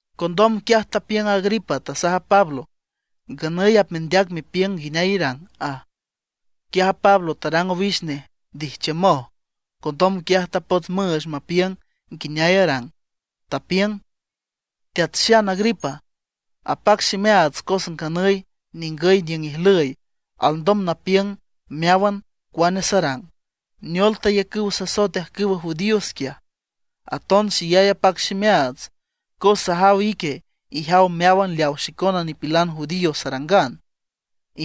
Condom quiaj tapiüng Agripa, tasaj a Pablo: ―Nganüy apmendeac mepiüng nguineay irang ―aj. Quiaj a Pablo tarang owix nej ndijchiümoj. Condom quiaj tapots müüch mapiüng nguineay arang, tapiüng: ―Teat Xan Agripa, apac ximeaats cos nganüy ningüy niüng ijlüy alndom napiüng meáwan cuane sarang, neol tayacüw sasoet ajcüwa judíos quiaj. Aton xeyay apac ximeaats, cos sajaw ique ijaw meáwan leawa xicona nipilan judío sarangan,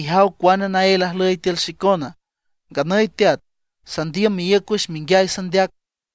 ijaw cuane naél ajlüy tiül xicona. Nganüy teat, sandiüm meíüc wüx menguiay sandeac.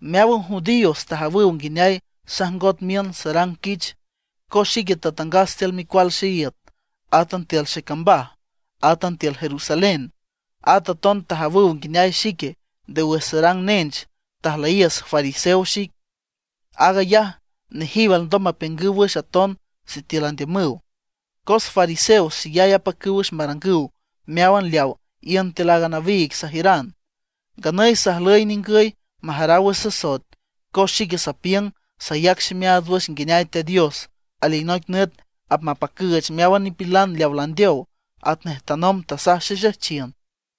’Meáwan judíos tajawüw nguineay sajngot miün sarang quich, cos xique tatangas tiül micual xeíüt, átan tiül xecambaj, átan tiül Jerusalén. At aton tajawüw nguineay xique nde wüx sarang nench tajlüyiüs fariseo xic. Aag ayaj nejiw alndom mapiüngüw wüx aton sitiül andiümüw, cos fariseos xeyay apacüw wüx marangüw meáwan leaw iün tiül a nawiig sajiüran. Nganüy sajlüy ningüy majaraw wüx sasoet, cos xique sapiüng sayac ximeaats wüx nguineay Teat Dios alinoic nüt apmapacüüch meáwan nipilan leaw landeow, atnej tanomb tasaj xexejchiün.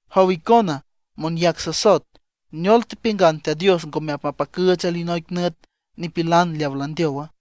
Jow icona, monyac sasoet ¿neol tepiüngan Teat Dios ngome apmapacüüch alinoic nüt nipilan leaw landeowa?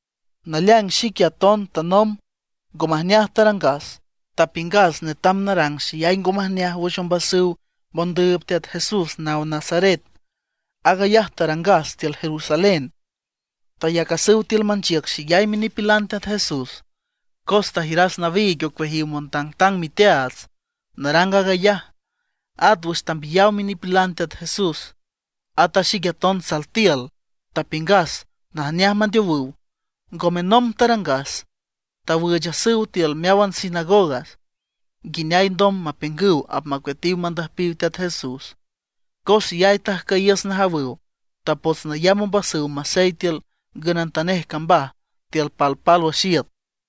’Naleaing xique aton tanomb ngo majneaj tarangas, tapiüngas netam narang xeyay ngo majneaj wüx ombasüw mondüüb Teat Jesús naw Nazaret. Aag ayaj tarangas tiül Jerusalén. Tayacasüw tiül manchiüc xeyay minipilan Teat Jesús, cos tajiüras nawiig ocueajiw montangtang miteaats narang aag ayaj. At wüx tambiyaw minipilan Teat Jesús, at a xique aton sal tiül, tapiüngas najneaj mandeowüw. Ngome nomb tarangas, tawüüchasüw tiül meáwan sinagogas, nguineay ndom mapiüngüw apmacueatiw mandüjpiw Teat Jesús. Cos xeyay tajcüyiüs najawüw; tapots nayamb ombasüw masey tiül ngünantanej cambaj tiül palpálwüx iüt.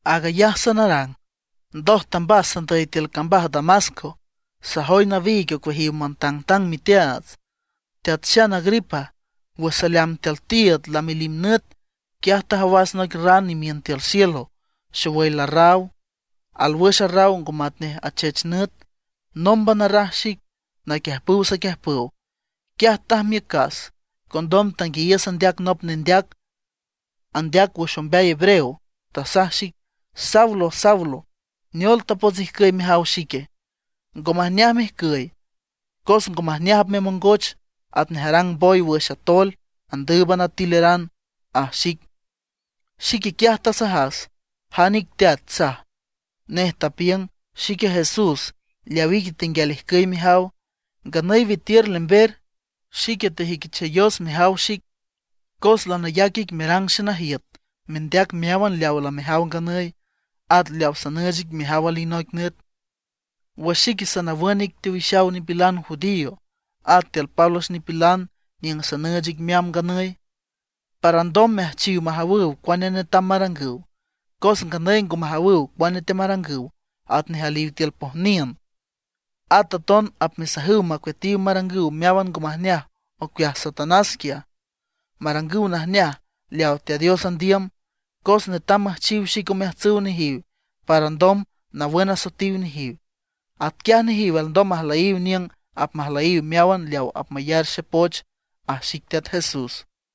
’Aag ayaj sanarang, ndoj tambas sandüy tiül cambaj Damasco, sajoy nawiig ocueajiw montangtang miteaats. Teat Xan Agripa, wüx saleamb tiül tiiüd lalimnüt, quiaj tajawas noic ran imiün tiül cielo, xowüy larraw, alwüx arraw ngo matnej achech nüt. Nómban arraj xic naquiüjpüw saquiüjpüw. Quiaj tajmiücas, condom tanguiayiüs andeac nop nendeac, andeac wüx ombeay hebreo, tasaj xic: “Saulo, Saulo, ¿neol tapots ijcüy mejaw xique? Ngo majneaj mejcüy, cos ngo majneaj apmemongoch, atnej arang boy wüx atoel, andüüb atileran”, aj xic. Xique quiaj tasajas: “¿Jan ic Teat?” saj. Nej tapiüng: “Xique Jesús, leaw ique tenguial ijcüy mejaw. Nganüy witiür lember. Xique tejüiquichayos mejaw xic, cos lanayac ic merang xenajiüt, mendeac meáwan leawa lamejaw nganüy, at leawa sanüüch ic mejaw alinoic nüt, wüx xique sanawün ic teowixaw nipilan judío, at tiül pálwüx nipilan niüng sanüüch ic meamb nganüy, para alndom meajchiw majawüw cuane netam marangüw. Cos nganüy ngo majawüw cuane teamarangüw, atnej aliw tiül pojniün. At aton apmesajüw macueatiw marangüw meáwan ngo majneaj ocueaj Satanás quiaj, marangüw najneaj leaw Teat Dios andiüm. Cos netam müjchiw xic omeajtsüw nejiw para alndom nawün asoetiw nejiw. Atquiaj nejiw alndom majlüyiw niüng apmajlüyiw meáwan leaw apmayar xepoch”, aj xic teat Jesús.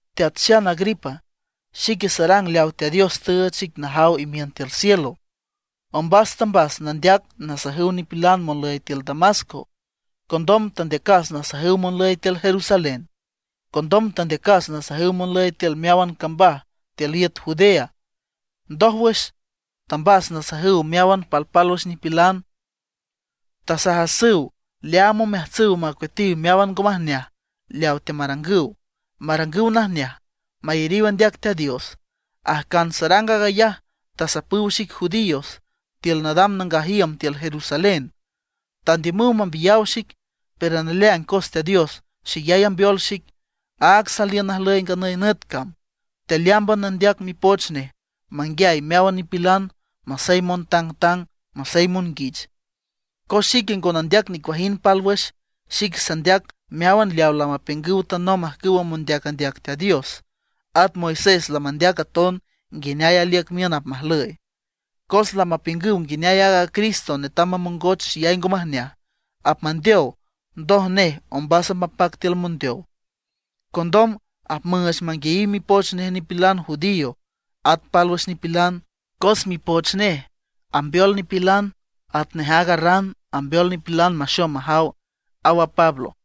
’Teat Xan Agripa, xique sarang leaw Teat Dios tüüch xic najaw imiün tiül cielo. Ombas tambas nandeac nasajüw nipilan monlüy tiül Damasco. Condom tandeacas nasajüw monlüy tiül Jerusalén. Condom tandeacas nasajüw monlüy tiül meáwan cambaj tiül iüt Judea. Ndójwüx tambas nasajüw meáwan palpálwüx nipilan. Tasajasüw leaam omeajtsüw macueatiw meáwan ngo majneaj leaw teamarangüw, marangüw najneaj, mayariw andeac Teat Dios. Ajcan sarang aag ayaj tasapüw xic judíos tiül nadam nangaj iüm tiül Jerusalén; tandiümüw mambiyaw xic. Pero naleaing cos Teat Dios xeyay ambeol xic, áag saliün najlüy nganüy nüt cam, tealeámban nandeac Mipoch nej manguiay meáwan nipilan masey montangtang, masey monguich. Cos xique ngo nandeac nicuajind pálwüx; xique sandeac meáwan leaw lamapiüngüw tanomb ajcüwa mondeac andeac Teat Dios. At Moisés lamandeac aton nguineay aliüc miün apmajlüy. Cos lamapiüngüw nguineay aaga Cristo netam mamongoch xeyay ngo majneaj, apmandeow, ndoj nej ombas apmapac tiül mondeow; condom apmüüch manguiayiw mipoch nej nipilan judío at pálwüx nipilan, cos mipoch nej ambeol nipilan atnej aaga ran ambeol nipilan maxom majaw ―aw a Pablo.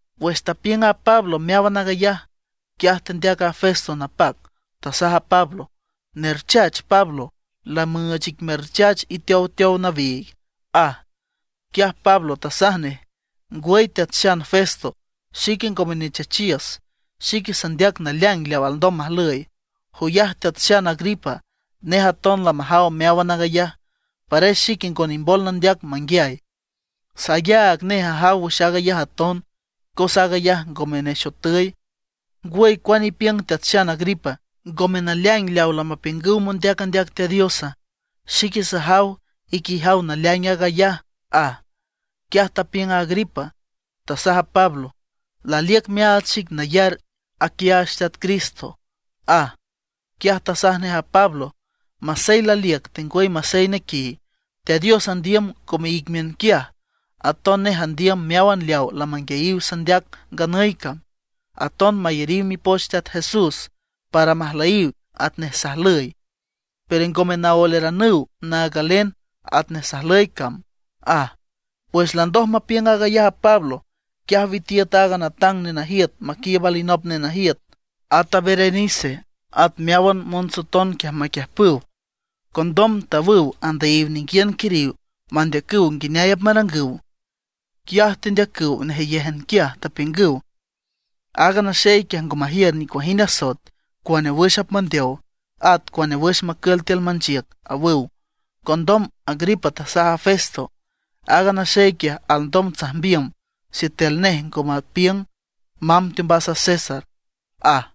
Wüx tapiüng a Pablo meáwan aag ayaj, quiaj tendeac a Festo napac, tasaj a Pablo: ―¡Nerchach Pablo! lamüüch ic merchach iteowteow nawiig ―aj. Quiaj Pablo tasaj nej: ―Ngwüy teat xan Festo, xique ngome nechachiüs, xique sandeac naleaing leaw alndom majlüy. Joyaj Teat xan Agripa, nej aton lamajaw meáwan aag ayaj, pares xique ngo nimbol nandeac manguiay. Sayaag nej ajaw wüx aag ayaj aton cos aag ayaj ngome nexotüy. ¿Ngwüy cuane ipiüng Teat xan Agripa, ngome naleaing leaw lamapiüngüw mondeac andeac Teat Diosa? Xique sajaw ique ijaw naleaing aag ayaj ―aj. Quiaj tapiüng a Agripa, tasaj a Pablo: ―¡Laliüc meaach xic nayar aquiaach Teat Cristo! ―aj. Quiaj tasaj nej a Pablo: ―Masey laliüc tengwüy masey nequiy, Teat Dios andiüm ngome ic miün quiaj, aton nej andiüm meáwan leawa lamanguiayiw sandeac nganüy cam, aton mayariw mipoch Teat Jesús para majlüyiw atnej sajlüy. Pero ngome naoeleranüw naag galen atnej sajlüy cam ―aj. Wüx landoj mapiüng aag ayaj a Pablo, quiaj witiüt aaga natang nenajiüt maquiiüb alinop nenajiüt, at a Berenice, at meáwan montsoton quiaj maquiüjpüw. Condom tawüw andüyiw ninguiün quiriw mandeacüw nguineay apmarangüw. Quiaj tendeacüw nejeyéjan quiaj, tapiüngüw: ―Aaga naxey quiaj ngo majiür nicuajind asoet cuane wüx apmandeow, at cuane wüx macül tiül manchiüc ―awüw. Condom Agripa tasaj a Festo: ―Aaga naxey quiaj alndom tsajmbiüm sitiül nej ngo mapiüng mamb teombas a César ―aj.